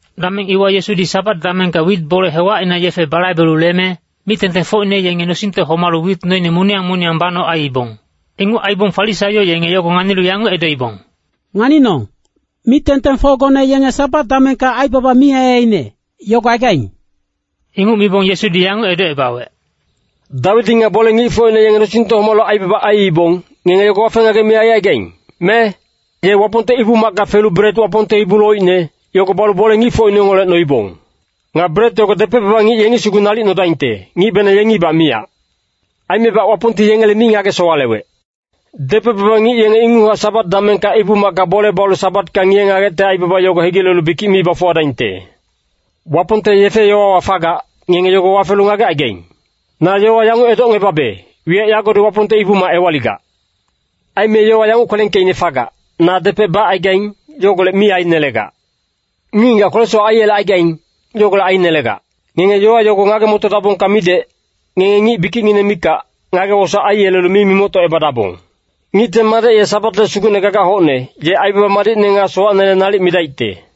Dameng iwa Yesudi Sabat damengka wit bole hewacina yefe balaibelu leme, mic-tengtengfocine yenge nosingte homalu wit noine moniyang moniyang banoc aiibong. Inguc aibong Farisaio yenge yogo nganilu yanguc edoibong, “Nganinong, mic-tengtengfocgone yenge Sabat damengka aibaba mi aiaiine, yogo aigaing.” Inguc mibong Yesudi yanguc edocebawec, “Dawidi nga bole-ngicfocine yenge nosingte homalu aibaba aiibong, ngenge yogo wafe-ngagec mi aicaigaing, me? Ye Wapongte Ibu-macka felu bret Wapongte ibu loicne, yogo balu bole-ngicfocine yengeholec noibong. Nga bret yogo depec-baba ngic yengi sugu nalic nodaingte, ngicbenang yengibac miyac. Aimebac Wapongti yengele mi ngage-sowalewec. Depec-baba ngic yenge inguchac Sabat damengka Ibu-macka bole balu Sabatka ngiye-ngagecte aibaba yogo hegilelu bikic mi bafuwadaingte. Wapongte yefe-yowawa fagac, ngenge yogo wafelu ngagecaigaing. Na yowa yanguc edocngebabe, wiyac yagodi Wapongte Ibu-mac ewaligac. Aime yowa yanguc kwelengkeicne fagac, ‘Na depec bacaigaing, yogolec mi ainelegac. Ngic-ngigac kwele-sowac aiyelecaigaing, yogolec ainelegac.’ Ngenge yowa yogo ngage-motodabongka midec, ngenge ngic bikicngineng mikac, ngage-wosaec aiyelelu mi mimoctocebadabong. Ngicte Madec ye Sabatle Sugucne gagac hocne, ye aibaba madicne nga sowacnele nalic midaicte.”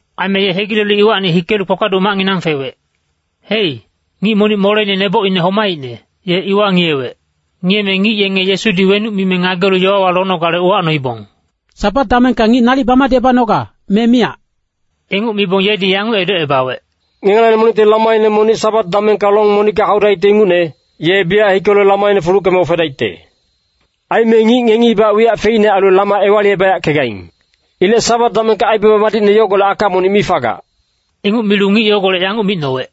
Aime ye hegilelu iwacni hikelu kpakpaduc macnginang fewec. Hei, ngic monic moleine neboc homaicne, ye iwa ngiyewec. Ngiyeme ngic yenge Yesudi wenuc mime ngagelu yowawa lonogale uwacnoibong, “Sabat damengka ngic nalic bamadicebanoga, me miyac?” Inguc mibong yedi yanguc edocebawec, “Ngengelacni monicti lamaine monic Sabat damengka long monicka haudaicte ingucne, ye biyac hikelu lamaine fuluckeme ofedaicte. Aime ngic ngengibac wiyac feicne ailu lama ewalicebayackegaing. Ilec Sabat damengka aibaba madicne yogolec aka monic mi fagac.” Inguc milu ngic yogolec yanguc micnowec,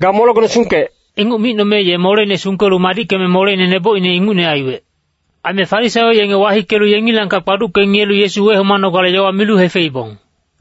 “Ga molegone sungkec.” Inguc micnome ye moleine sungkelu madickeme moleine nebocine ingucne aiwec. Aime Farisaio yenge wahikelu yengilangkac kpaducke ngiyelu Yesu wehomanogale yowa milu hefeibong.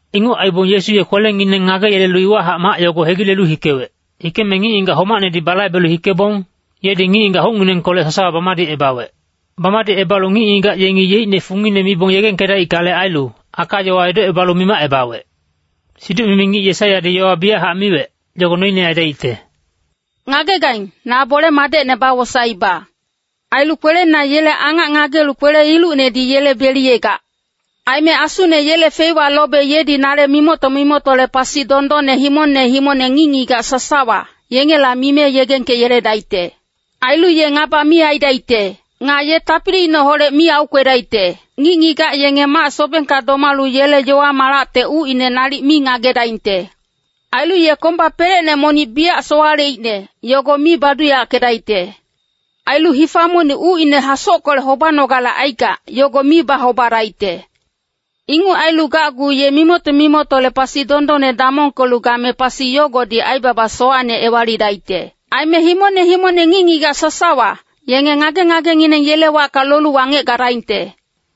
Inguc aibong Yesu ye kwelengineng ngageyelelu iwahac mac yogo hegilelu hikewec. Hikeme ngic-ngigac homacnedi balaibelu hikebong, yedi ngic-ngigac hucnginengkolec sasawa bamadicebawec. Bamadicebalu ngic-ngigac yengi yeicne fungine mibong yegengkedaickale ailu, aka-yowa edocebalu mimacebawec. Siduc-mimi ngic Yesaiyadi yowa biyachac miwec, yogo noine aidaicte, “Ngagegaing, na bole-madecne bawosaeiba. Ailu kwelena yele angac ngagelu kwele-ilucnedi yele beliyegac. Aime Asune yele feiwa lobe yedi nale mimocto-mimoctole pasi dondonne himongne himongne ngic-ngigac sasawa, yengela mime yegengkeyeledaicte. Ailu ye ngaba mi aidaicte. Nga ye tapiliineholec mi aukwedaicte. Ngic-ngigac yenge mac-sobengka domalu yele yowa-malacte ucine nalic mi ngagedaingte. Ailu ye komba pelecne monic biyac sowaleicne, yogo mi baduyackedaicte. Ailu hifa monic ucine hasockolec hobanogale aigac, yogo mi bahobadaicte. Inguc ailu gacgu ye mimocto-mimoctole pasi dondonne damongkelu game pasi yogodi aibaba sowacne ewalidaicte. Aime himongne himongne ngic-ngigac sasawa, yenge ngage-ngagengineng yele wacka lolu wangec gadaingte.”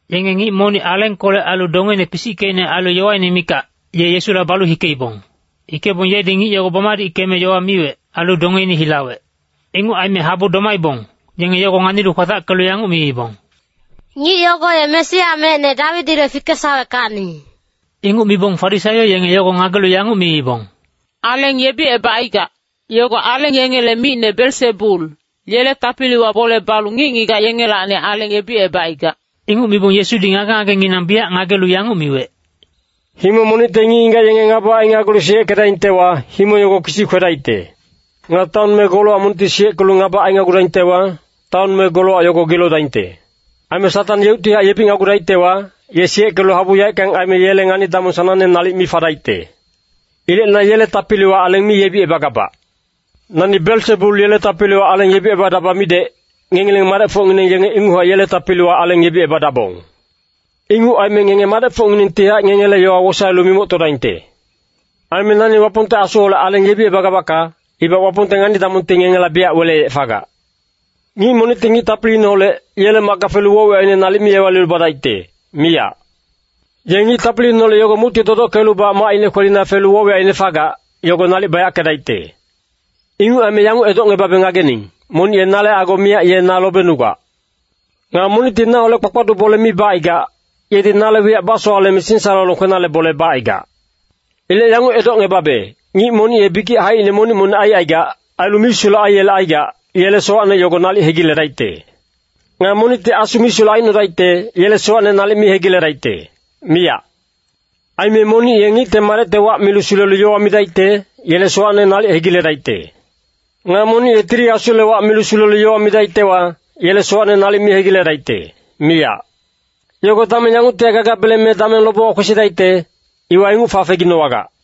Yenge ngic monic alengkolec ailu dongeine pisickeicne ailu yowaine mikac, ye Yesula balu hikeibong. Hikebong yedi ngic yogo bamadickeme yowa miwec, ailu dongeine hilawec. Inguc aime habu domaibong, yenge yogo nganilu kwatackelu yanguc miibong, “Ngic yogo ye Mesia mecne Dawidile fikesaweckacni.” Inguc mibong Farisaio yenge yogo ngagelu yanguc miibong, “Aleng yebicebacaigac, yogo aleng yengele micne Belsebul, yele tapiliwa bole balu ngic-ngigac yengelacni aleng yebicebacaigac.” Inguc mibong Yesudi ngage-ngagenginang biyac ngagelu yanguc miwec, “Himong monicte ngic-ngigac yenge ngaba ainagulu siyeckedaingtewa, himong yogo kisi kwedaicte. Nga taon me golowac monicti siyeckelu ngaba ainagudaingtewa, taon me golowac yogo gilodaingte. Aime Satang yeuctihac yebicnagudaictewa, ye siyeckelu habu yaeckang aime yele ngani-damong sanangne nalic mi fadaicte. Ilec na yele tapiliwa aleng mi yebicebagabac. Nani Belsebul yele tapiliwa aleng yebicebadaba midec, ngengileng madecfocngineng yenge inguchac yele tapiliwa aleng yebicebadabong. Inguc aime ngenge madecfocnginengtihac ngengele yowa wosaelu mimoctodaingte. Aime nani Wapongte Asuholec aleng yebicebagabacka, ibac Wapongte ngani-damongti ngengela biyac weleyec fagac. “Ngic monicti ngic tapiliineholec, yele macka felu woc-wiyacine nalic mi ewalilu badaicte, miyac. Ye ngic tapiliineholec yogo mucti dodockelubac macine kwelina felu woc-wiyacine fagac, yogo nalic bayackedaicte.” “Inguc aime yanguc edocngebabe ngagening, monic ye nale ago miyac ye na lobenugac. Nga monicti naholec bakpaduc bole mi bacaigac, yedi nale wiyac basowaleme singsalolong kwenale bole bacaigac. Ilec yanguc edocngebabe, ngic monic ye bikic haicine monic-monic aicaigac, ailu misulec aiyelecaigac, yele sowacne yogo nalic hegiledaicte. Nga monicti Asu misulec aicnodaicte, yele sowacne nalic mi hegiledaicte, miyac. Aime monic ye Ngicte Madecte wac milu sulelu yowa midaicte, yele sowacne nalic hegiledaicte. Nga monic ye Tili Asule wac milu sulelu yowa midaictewa, yele sowacne nalic mi hegiledaicte, miyac. Yogo dameng yanguctihac gagabeleng me dameng lobewa kwesidaicte, iwa inguc fafeginowagac.”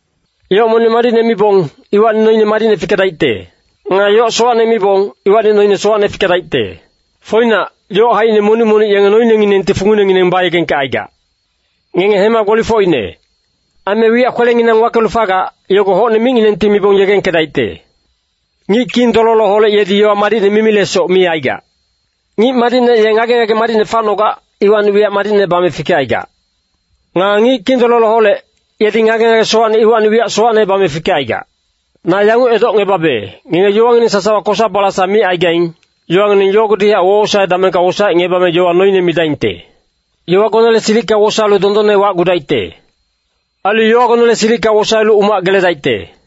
“Yoc monic madicne mibong, iwacni noine madicne fikedaicte. Nga yoc sowacne mibong, iwacni noine sowacne fikedaicte. Foinac, yoc haicine monic monic yenge noinenginengti funginengineng bayegengkecaigac. Ngenge hema gbolifocine. Aime wiyac kwelenginang wakelu fagac, yogo hocne micnginengti mibong yegengkedaicte. Ngic kindololoholec yedi yowa madicne mimilesoc mi aigac. Ngic madicne ye ngage-ngage madicne facnogac, iwacni wiyac madicne bame fikecaigac. Nga ngic kindololoholec, yedi ngage-ngage sowacne iwacni wiyac sowacne bame fikecaigac. Na yanguc edocngebabe, ngenge yowangineng sasawa kosa-balasa micaigaing, yowangineng yogodihac wowosae damengka wosaecngebame yowa noine midaingte. Yowagonele silicka wosaelu dondonne wacgudaicte. Ailu yowagonele silicka wosaelu umac geledaicte.”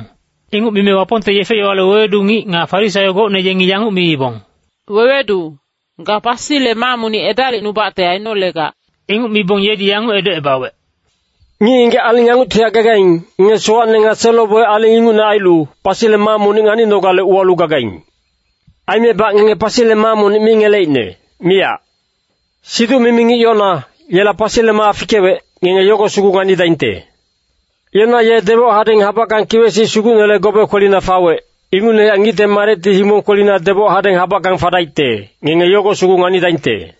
Inguc mime Wapongte yefe-yowale wewedu ngic nga Farisaio gocne yengi yanguc miibong, “Wewedu, ga pasile maa monic edalicnubacte ainolegac.” Inguc mibong yedi yanguc edocebawec, “Ngic-ngigac aling yanguctihac gagaing, ngenge sowacne nga selo-boic aling ingucne ailu, pasile maa monic nganinogale uwalu gagaing. Aimebac ngenge pasile maa monic mi ngeleicne, miyac. Siduc-mimi ngic Yona, yela pasile maa fikewec, ngenge yogo sugu nganidaingte. Yona ye deboc hadeng habackang kiwec-sic sugucnele gobe kwelina fawec, ingucnehac Ngicte Madecti himong kwelina deboc hadeng habackang fadaicte, ngenge yogo sugu nganidaingte.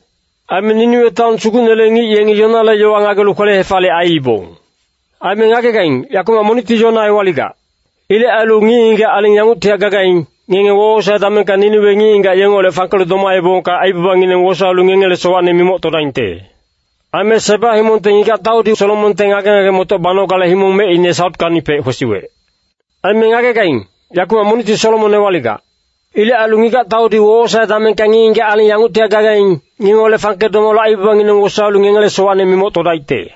Aime Niniwe taon sugucnele ngic yengi Yonale yowa ngagelu kwele-hefaliyec aiibong. Aime ngagegaing, yakumac monicti Yona ewaligac. Ilec ailu ngic-ngigac aling yanguctihac gagaing, ngenge wowosae damengka Niniwe ngic-ngigac yengeholec fangkelu domaebongka aibabangineng wosaelu ngengele sowacne mimoctodaingte. Aime Seba himongte ngigac-taudi Solomonte ngage-ngage-motoc banogale himong mecine sautkacnipec kwesiwec. Aime ngagegaing, yakumac monicti Solomon ewaligac. Ilec ailu ngigac-taudi wowosae damengka ngic-ngigac aling yanguctihac gagaing, ngengeholec fangke domalu aibabangineng wosaelu ngengele sowacne mimoctodaicte.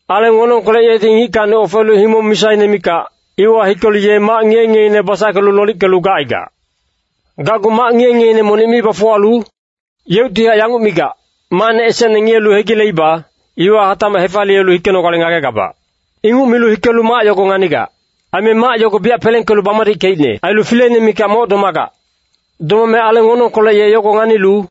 “Aleng wonongkolec yedi ngickacni ofelu himong misaine mikac, iwa hikelu ye mac ngiye-ngiyeine basackelu lolickelu gacaigac. Gacgu mac ngiye-ngiyeine monic mi bafuwalu, yeuctihac yanguc migac, ‘Macne esecne ngiyelu hegileiba, iwa hatacmac hefaliyelu hikenogale ngagegabac.’ Inguc milu hikelu mac yogo nganigac. Aime mac yogo biyac pelengkelu bamadickeicne. Ailu fileine mikac moc domagac. Domame aleng wonongkolec ye yogo nganilu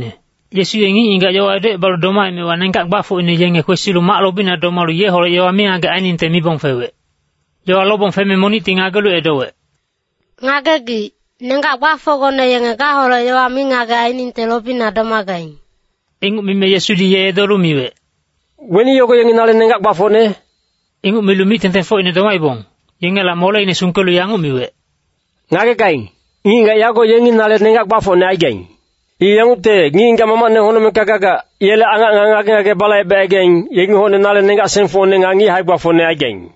Yesu ye ngic-ngigac yowa edocebalu domaemewa nenggac gbafocine yenge kwesilu mac lobina domalu yeholec yowa mingagec ainingte mibong fewec. Yowa lobong feme monicti ngagelu edowec, “Ngagegic, nenggac gbafocgone yenge gaholec yowa mingagec ainingte lobina domagaing.” Inguc mime Yesudi ye edolu miwec, “Weni yogo yengi nale nenggac gbafocne?” Inguc milu mic-tengtengfocine domaibong, yengela moleine sungkelu yanguc miwec, “Ngagegaing, ngic-ngigac yago yengi nale nenggac gbafocne aigaing. I yangucte, ngic-ngigac Mamacne honocmengka gagac, yele angac nga ngage-ngage balaibecaigaing, yengi hocne nale nenggac-sengfocne nga ngic hae-gbafocne aigaing.”